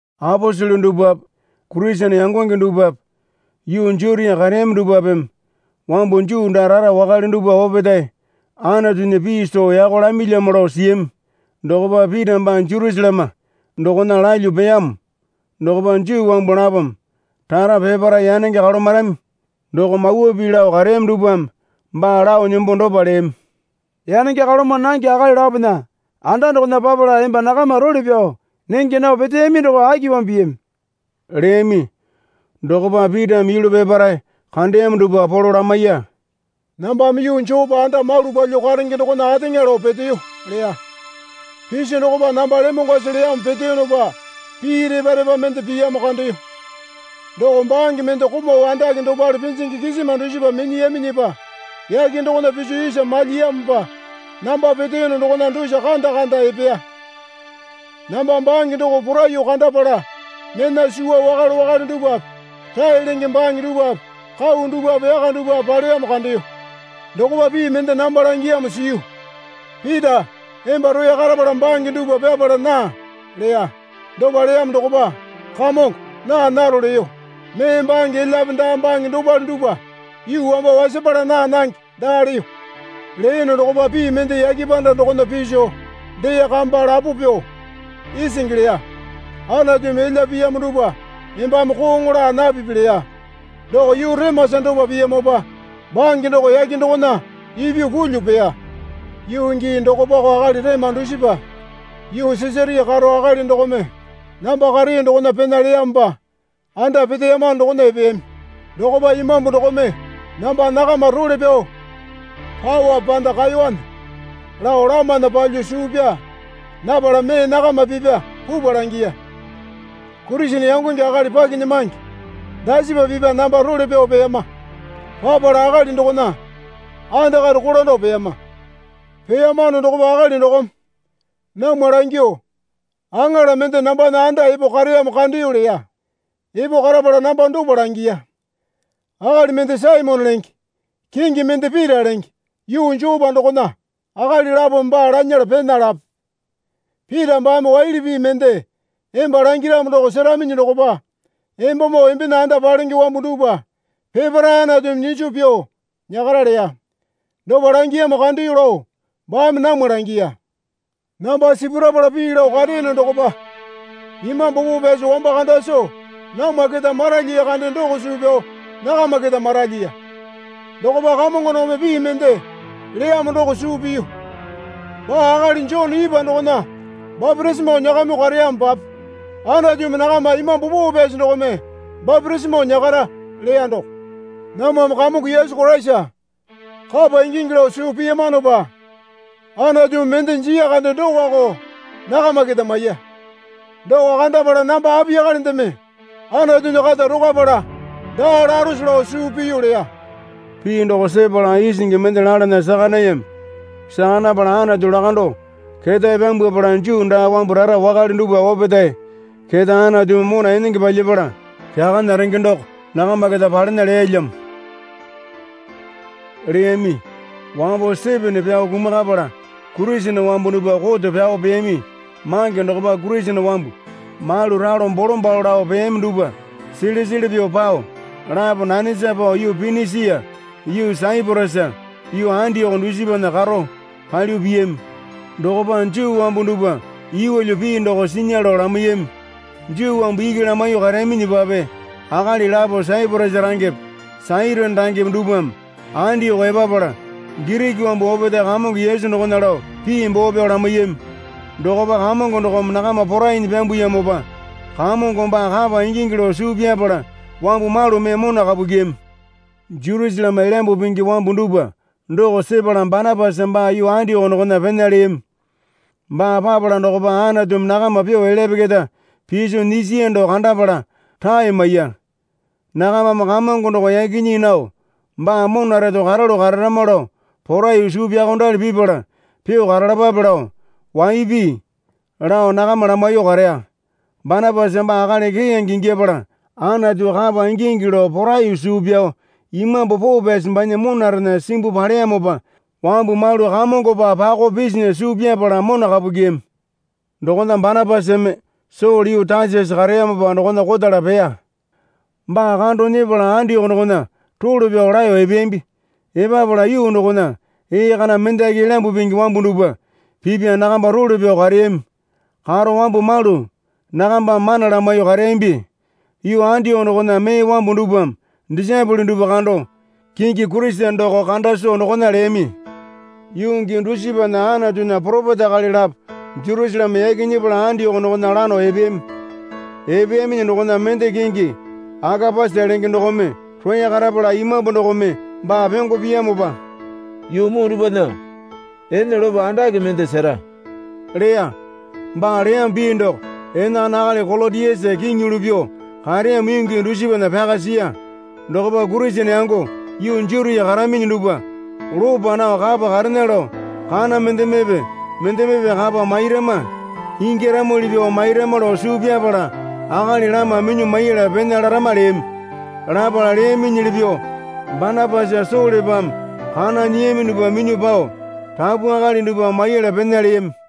Aposele dupwape Kurisene yangonge dupwape yuu Jutia kareyami dupwapeme wambu Juu daa rara wakale dupwa opetae Anatunya pii soo yako lamilyamo lao siyami. Dokopa Pita baa Jerusaleme dokona lalyuo peyamo dokopa Juu wambu lapome rara peparae yanenge kalomarami doko mawa pii lao kareyami dupwame baa lao nembo dopa leyami. Yanenge kaloma nange akali lapona anda dokona papala emba nakama role pyao nenge nao peteyami doko akipamo piyami? leyami. Dokopa Pitame yulu peparae kandeyamo dupwa polo lamaiya. Nambame Yuu Jopa anda malu palyuo karenge dokona ateŋa lao peteyo, leya. Piso dokopa namba lemongwasi leyamo peteyonopa pii repa repa mende piyamo kandeyo. Doko bange mende komau andake dopale pinjingi kisima dusipa minyiyaminyipa yake dokona piso isa malyiyamopa namba peteyono dokona dusa kanda kanda epeya. Namba bange doko poraiyuo kandapala mena suwa wakale wakale dupwape rae lenge bange dupwape kau dupwape yaka dupwape paleyamo kandeyo. Dokopa pii mende namba langiyamo siyu. Pita, emba roya karapala bange dupwa pyapala naa, leya. Dopa leyamo dokopa, Kamongo naa naro leyo. Mee bange elyape daa bange dopale dupwa yuu wamba wasapala naa nange daa leyo. Leyono dokopa pii mende yake panda dokona piso dee kamba lapo pyuo isingi leya. Anatumi elya piyamo dupwa embame kooŋo laa napipi leya. Doko yuu remasa dopa piyamopa bange doko yake dokona ipyuo pulyuo peya. Yuu gii dokopako akali rema dusipa yuu Sisaria karo akali dokome namba kareyo dokona pena leyamopa anda peteyamano dokona epeyami. Dokopa Imambu dokome namba nakama role pyao paowape panda kaewane lao lamana palyuo suu pyaa napala mee nakama pipya pupwa langiya. Kurisene yangonge akali pakinyamange dasipa pipya namba role pyao peyama. Papala akali dokona andakare kolando peyama. Peyamano dokopa akali dokome namwa langyuo, Aŋala mende nambana anda epo kareyamo kandeyo, leya. Epo karapala namba dopa langiya. Akali mende Saimone lenge kingi mende Pita lenge yuu Jopa dokona akali lapome baa lanyala pena lape. Pita baame waili pii mende emba langiramo doko seraminyi dokopa embamoo embena anda palenge wambu dupwa peparae Anatumi nyiso pyuo nyakara leya. Dopa langiyamo kandeyo lao baame namwa langiya. Namba sipurapala pii lao kareyono dokopa Imambu Poo Pyasi wamba kanda soo namwa keta maralyiya kande doko suu pyao nakama keta maralyiya. Dokopa Kamongo dokome pii mende leyamo doko suu piyu. Baa akali Jone ipwa dokona bapitisimo nyakamyuo kareyamopape Anatumi nakama Imambu Poo Pyasi dokome bapitisimo nyakara, leya doko. Namwame Kamongo Yesu Koraisa kapa ingingi lao suu piyamanopa Anatumi mende jiya kande dokoko nakama keta maiya. Doko kandapala namba apiyakalendeme Anatunya kata rokwapala daa larose lao suu piyu leya. Pii doko sepala isingi mende lalana saka nayami. Saka napala Anatu lakandao ketae pyambwapala Juu daa wambu rara wakale dupwa opetae keta Anatumi mona enenge palyapala kyakana renge doko nakama keta palena leyalyamo, leyami. Wambo Sitipena pyao kumakapala Kurisene wambu dupwa koto pyao peyami mange dokopa Kurisene wambu malu ralo bolombalo lao peyami dupwa sele sele pyuo pao lapo nanesa pao yuu Pinisia yuu Saiporasa yuu Andioko dusipana karo palyuo piyami. Dokopa Juu wambu dupwa yeelyo pii doko sinya lao lamaiyami. Juu wambu iki lamaiyuo kareyaminyipape akali lapo Saiporasa rangepe Sairini rangepe dupwame Andioko epapala Giriki wambu opetae Kamongo Yesu dokona lao pii boo pyao lamaiyami. Dokopa Kamongo dokome nakama porainyi pyambuyamopa Kamongo baa kapa ingingi lao suu pyapala wambu malu mee mona kapu kyiyami. Jerusaleme Elyambu Pingi wambu dupwa doko sepala Banapasa baa yuu Andioko dokona pena leyami. Baa papala dokopa Anatumi nakama pyuo elyape keta piso nyisiya doko kandapala rae maiya. Nakamame Kamongo doko yaki nyii nao baa mona reto karalu kararama lao poraiyuo suu pyaokondali pipala pyuo karalapape, lao waipi lao nakama lamaiyuo kareya. Banapasa baa akali keyange ingyapala Anatu kapa ingingi lao poraiyuo suu pyao Imambu Poo Pyasi banya monarena simbuo paleyamopa wambu malu Kamongopa pakao pisinya suu pyapala mona kapu kyiyami. Dokona Banapasame Sole yuu Tasasa kareyamopa dokona kotala peya. Baa kando nyepala Andioko dokona role pyao laeyo epeyambi. Epapala yuu dokona ee kana mendaki Elyambu Pingi wambu dupwa pipya nakamba role pyao kareyami. Karo wambu malu nakambame mana lamaiyuo kareyambi. Yuu Andioko dokona mee wambu dupwame disaepole dupwa kando kingi Kurisene doko kanda soo dokona leyami. Yuu gii dusipana Anatunya poropeta akali lapo Jerusaleme yaki nyepala Andioko dokona lano epeyami. Epeyaminyi dokona mende kingi Akapasa lenge dokome roya karapala Imambu dokome baa pyongo piyamopa, yuu muu dupwana ene lopo andake mende sera leya. (Baa leyamo pii doko enakana akali Kolotiasa kiŋi yulu pyuo kareyamo yuu gii dusipana pyaka siya.) Dokopa Kurisene yango yuu Jutia karaminyi dupwa lopa nao kapa karena lao kana mendemepe mendemepe kapa mairama ingyaramuli pyuo mairama lao suu pyapala akali lama minyuo maiyala pena larama leyami. Lapala leyaminyili pyuo Banapasa Solepame kana nyiyami dupwa minyuo pao rapu akali dupwa maiyala pena leyami.